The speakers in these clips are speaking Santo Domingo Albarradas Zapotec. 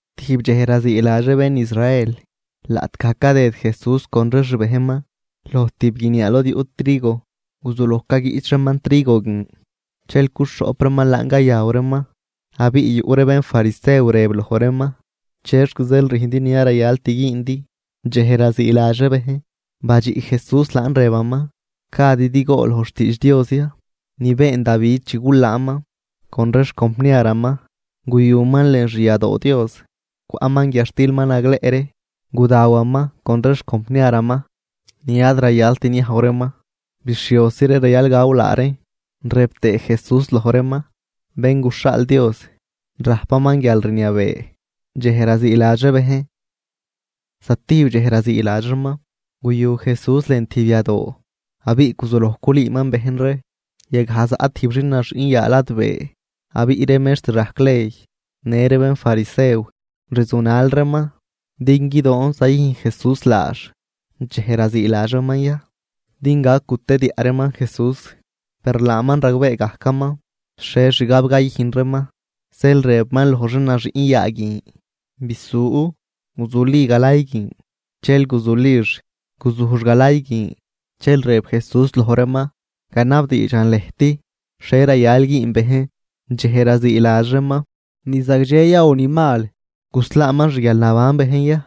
Tijb dxej raziiladx ree bén Israel, laꞌtgaj cadëd Jesús con ree xbejnman loj tijb guiniaa lod yuꞌ trigo. Guzuloj caguiꞌch reeman trigo guin, dxel cuxhoꞌp reeman laan cayaw reeman. Abiꞌ yuꞌ ree bénfarisew rëb loj reeman: ―¿Chexc zeel rüjndi ni ad rayalt güündi dxej raziiladx ree bejn? Badxiꞌ Jesús laan, rëbaman: ―¿Gadidi gool loj xtiidx Dios ya ni been Davi chi gulaanman con ree xcompniaraman? Guyuman lën xyadoo Dios, cwaꞌman guiadxtil ma nagleꞌ ree gudawaman con ree xcompniaraman, ni ad rayalt niajw reeman bixhiosi ree rayal gaw laa reen. Rëb tëë Jesús loj reeman: ―Bén guxhaal Dios rajpaman guialrniabee dxej raziiladx ree bejn. Zatijb dxej raziiladx reeman, guyu Jesús lën tijb yadoo abiꞌ guzuloj culüüman bejn ree. Yagaj zaꞌ tijb xin naxüꞌn yaa ladbee. Abiꞌ ree mextr rajc ley në ree bénfarisew rzunal reeman din guidoon zayüjn Jesús laax dxej raziiladx reeman ya, din gac gutediaꞌ reeman Jesús. Per laaman ragbee gajcaman xhie xgab cayüjn reeman, zeel rëbaman loj xin naxüꞌn yaa guin: ―Bisu, guzuli galay guin. Dxel guzulix, guzujx galay guin. Dxel rëb Jesús loj reeman: ―Ganabdiidxan lëjt: ¿Xhie rayal güün bejn dxej raziiladx reeman, ni zagdxe ya o ni mal? ¿Guslaaman xguialnaban bejn ya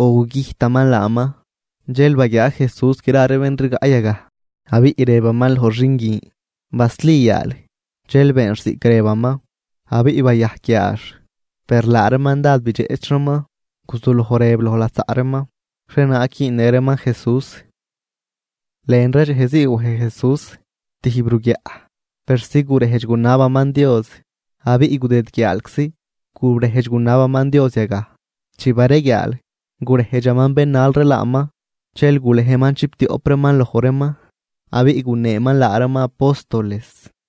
o gugüjtaman laaman? Dxel baguiaa Jesús gra ree bén rigaꞌ yagaj, abiꞌ rëbaman loj xin guin: ―Basli yaal. Dxel beenx ziꞌc rëbaman, abiꞌ bayajc yaax. Per laa reeman dád bidxeꞌch reeman, guzuloj rëb loj lasaꞌ reeman xhienaag güünnë reeman Jesús. Lën ree dxej zii wej Jesús tijb ruguiaꞌ persi gurejdx gunabaman Dios, abiꞌ gudëd guiaalczi gurejdx gunabaman Dios yagaj. Chi bareguiaal, gurejdxaman bén nal ree laaman, dxel gulejman chiptioꞌp reeman loj reeman, abiꞌ guneeman laa reeman apóstoles.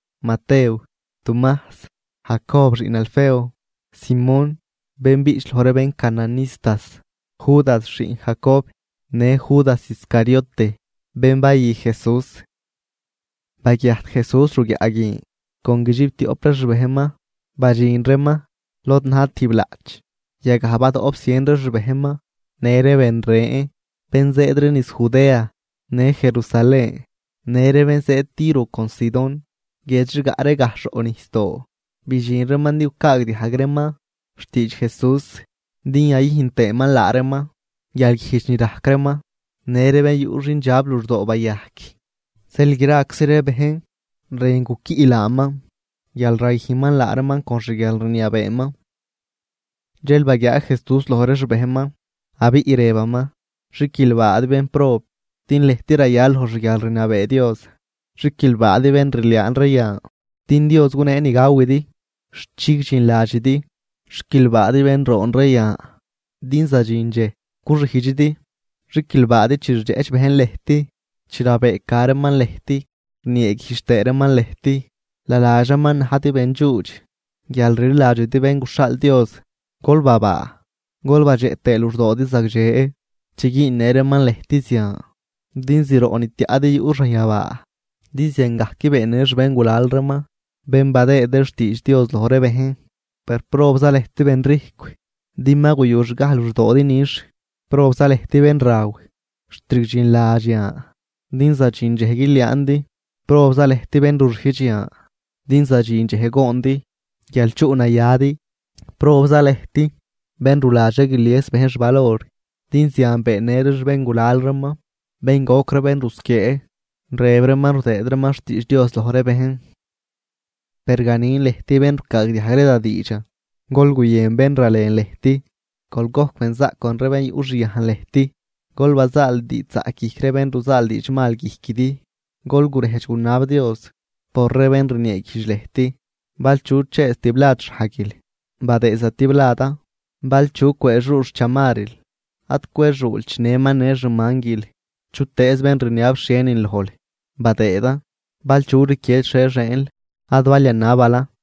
Matew, Tumajs, Jacob xiꞌn Alfeo, Simón, bén biꞌch loj ree bén cananistas, Judas xiꞌn Jacob, në Judas Iscariote bén bayü Jesús. Baguiajt Jesús ruguiaꞌ guin con guidxiptioꞌp ree xbejnman, badxin reeman lod na̱j tijb laꞌch. Yagaj badoꞌp zien ree xbejnman në ree ben ren, bén zëëd ree niz Judea në Jerusalén në ree bén zëëd Tiro con Sidón, guiedx rigaꞌ ree gajxh roꞌ nijsdoo. Bidxin reeman din gucaagdiajg reeman xtiidx Jesús din yayüjn tëëman laa reeman guialguijdx ni rajc reeman. Në ree bén yuꞌ xindxab luxdoo bayajc. Zeel graczi ree bejn rën guquiꞌ laaman, guial rayüjnman laa reeman con xguialrniabeeman. Dxel baguiaa Jesús loj ree xbejnman, abiꞌ rëbaman: ―Xiquilbaadi bénprob, din lëjt rayal loj xguialrniabee Dios. ’Xiquilbaadi bén rliaan ree yan, din Dios gunee ni gawidi xt chigdxinladxidi. ’Xiquilbaadi bén roon ree yan, din zadxin dxej guxijdxidi. ’Xiquilbaadi chi rdxeꞌch bejn lëjt, chi rabëëca reeman lëjt, rnieeguijdx tëë reeman lëjt, naladx reeman najdi bendxuudx guial rliladxidi Bén guxhaal Dios. Gol babaa gol badxeꞌ tëë luxdoodi zagdxe chi güünnë reeman lëjt zian, din zroꞌ ni tiaꞌdi yuꞌ xanyabaa, din ziangajc beennë xbéngulal reeman bén badëë ree xtiidx Dios loj ree bejn. ’Per probza lëjt benrijcw, din ma guyuxgaj luxdoodi nix. ’Probza lëjt bén raw xt rigdxinladx yan, din zadxin dxej guiliaandi. ’Probza lëjt bén ruxijdx yan, din zadxin dxej goondi guial chuꞌnayadi. ’Probza lëjt, bén ruladx ree guilies bejn xvalor, din zian beennë ree xbéngulal reeman bén goc ree bén rusquiee, rëb reeman rudëë reeman xtiidx Dios loj ree bejn. ’Per ganin lëjt bén rucaagdiajg ree da diidxan: Gol guyën bén ralen lëjt, gol gojc benzaꞌc con ree bén yuꞌxyajn lëjt, gol bazaal diidxzaꞌc guijc ree bén ruzaal diidxmal guijquidi, gol gurejdx gunab Dios por ree bén rnieeguijdx lëjt. Bal chu chëëz tiblad xhajguil, badëëd zatibladan, bal chu cwëëxuu xchamarril, ad cwexuul chinëman në xmanguil. Chutëëz bén rniab xhienin lojl, badëëdan. Bal chu rquied xhie xieenl, ad bal yanabilan.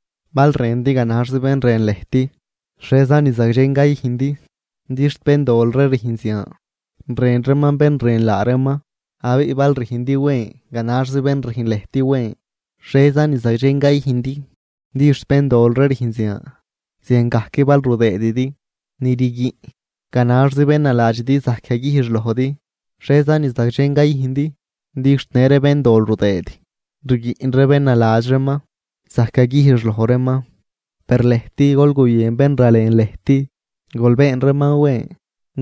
’Bal rëndi ganaxzi bén rën lëjt, ¿xhieza ni zagdxen cayüjndi? Din xt béndol ree rüjn zian, rën reeman bén rën laa reeman. Abiꞌ bal rüjndi wen ganaxzi bén rüjn lëjt wen, ¿xhieza ni zagdxen cayüjndi? Din xt béndol ree rüjn zian. Ziangajc bal rudëëdidi ni rguiꞌn ganaxzi bén naladxidi zajc yaguijx lojdi, ¿xhieza ni zagdxen cayüjndi? Din xt në ree béndol rudëëd rguiꞌn ree bén naladx reeman zajc yaguijx loj reeman. Per lëjt gol guyën bén ralen lëjt, gol been reeman wen.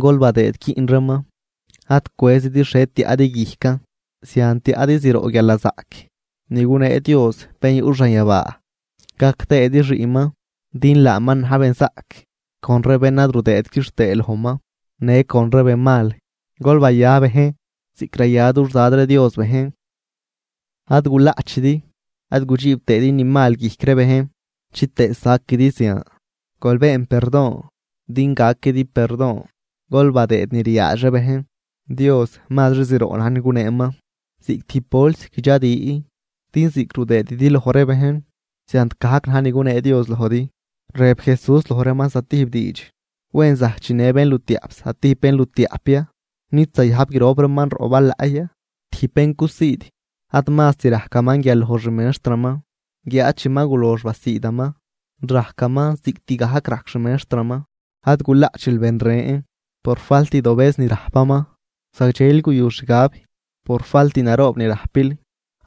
Gol badëëd quiꞌn reeman, ad cwëzidi xhie tiaꞌdi guijcan. Zian tiaꞌdi zroꞌ guialnazaꞌc ni gunee Dios bén yuꞌ xanyabaa, gac tëëdi xiꞌnman, din laaman na̱j benzaꞌc con ree bén ad rudëët quixtëë lojman në con ree benmal. Gol baya bejn ziꞌc raya dux Dad ree Dios bejn. ’Ad gulaꞌchidi, ad gudxiib tëëdi ni mal guijc ree bejn chitëë saquidi zian, gol been perdon din gaquidi perdon. Gol badëëd ni riaadx ree bejn, Dios mazri zroꞌ na̱j ni guneeman ziꞌc tijb bols guidxadi. Din ziꞌc rudëëdidi loj ree bejn, ziant gajc na̱j ni gunee Dios lojdi. Rëb Jesús loj reeman zatijb diidx: ―¿Wen zajc chinë bénlutiaꞌp zatijb bénlutiaꞌp ya? ¿Nid zayajb grop reeman roꞌ balaꞌ ya? Tijb bén cusiid, ad mazt rajcaman guial loj xmextraman. Guiáad chi ma gulox basiidaman rajcaman ziꞌctgajc rajc xmextraman. ’Ad gulaꞌchil ben ren por faltdobëz ni rajpaman, zagdxeli guyu xgab por falt naroob ni rajpil.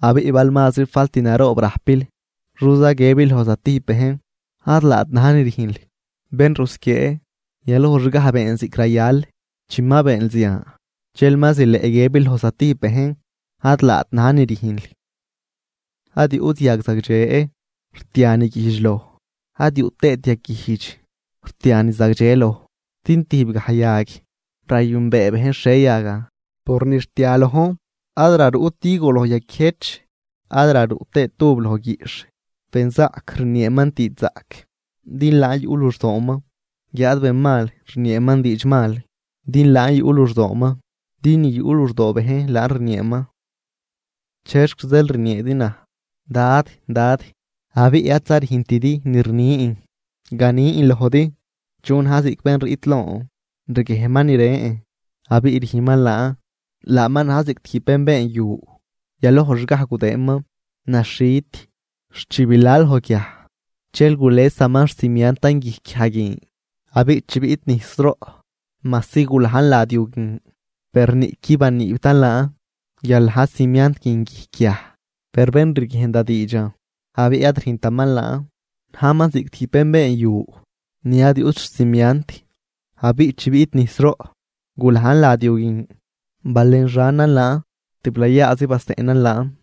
Abiꞌ bal mazri falt naroob rajpil, ¿xoza guiëbil loj zatijb bejn: “Ad laat na̱j ni rüjnl”? ¡Bén rusquiee! yalojxgaj been ziꞌc rayal, chi ma beenl zian dxel ma zileꞌ guiëbil loj zatijb bejn: “Ad laat na̱j ni rüjnl”. ’Ad yuꞌt yag zagdxe rtia ni guijdx loj, ad yuꞌ tëët yag guijdx rtia ni zagdxe loj. Din tijbgaj yag rayünbee bejn xhie yagan por ni rtia lojn. Ad raruꞌt higo loj yaquiëjch, ad raruꞌ tëët uv loj guiꞌxh. Benzaꞌc rnieeman diidxzaꞌc din laan yuꞌ luxdooman, guiáad benmal rnieeman diidxmal din laan yuꞌ luxdooman. Din ni yuꞌ luxdoo bejn laan rnieeman. ’¿Chexc zeel rnieedi naj, “Dad, Dad”, abiꞌ adza rüjntidi ni rnin? Ganin lojdi chu na̱j ziꞌc bén riꞌt lon, riguiejnman ni rën, abiꞌ rüjnman laan: laaman na̱j ziꞌc tijb bén been yu, yaloj xgaj gudëënman naxhit xt chi bila loj guiaj, dxel gulesaman xcimiantan guijc guiaj guin. Abiꞌ chi biꞌt nijsroꞌ majsi gulajn lad yu guin, per niꞌquid baniibtan laan guial na̱j cimiant guin guijc guiaj. Per bén riguiejn da diidxan abiꞌ ad rüjntaman laan, najman ziꞌc tijb bén been yu ni ad yuꞌt xcimiant. Abiꞌ chi biꞌt nijsroꞌ gulajn lad yu guin, balenxanan laan, tiblayaazi baseꞌnan laan.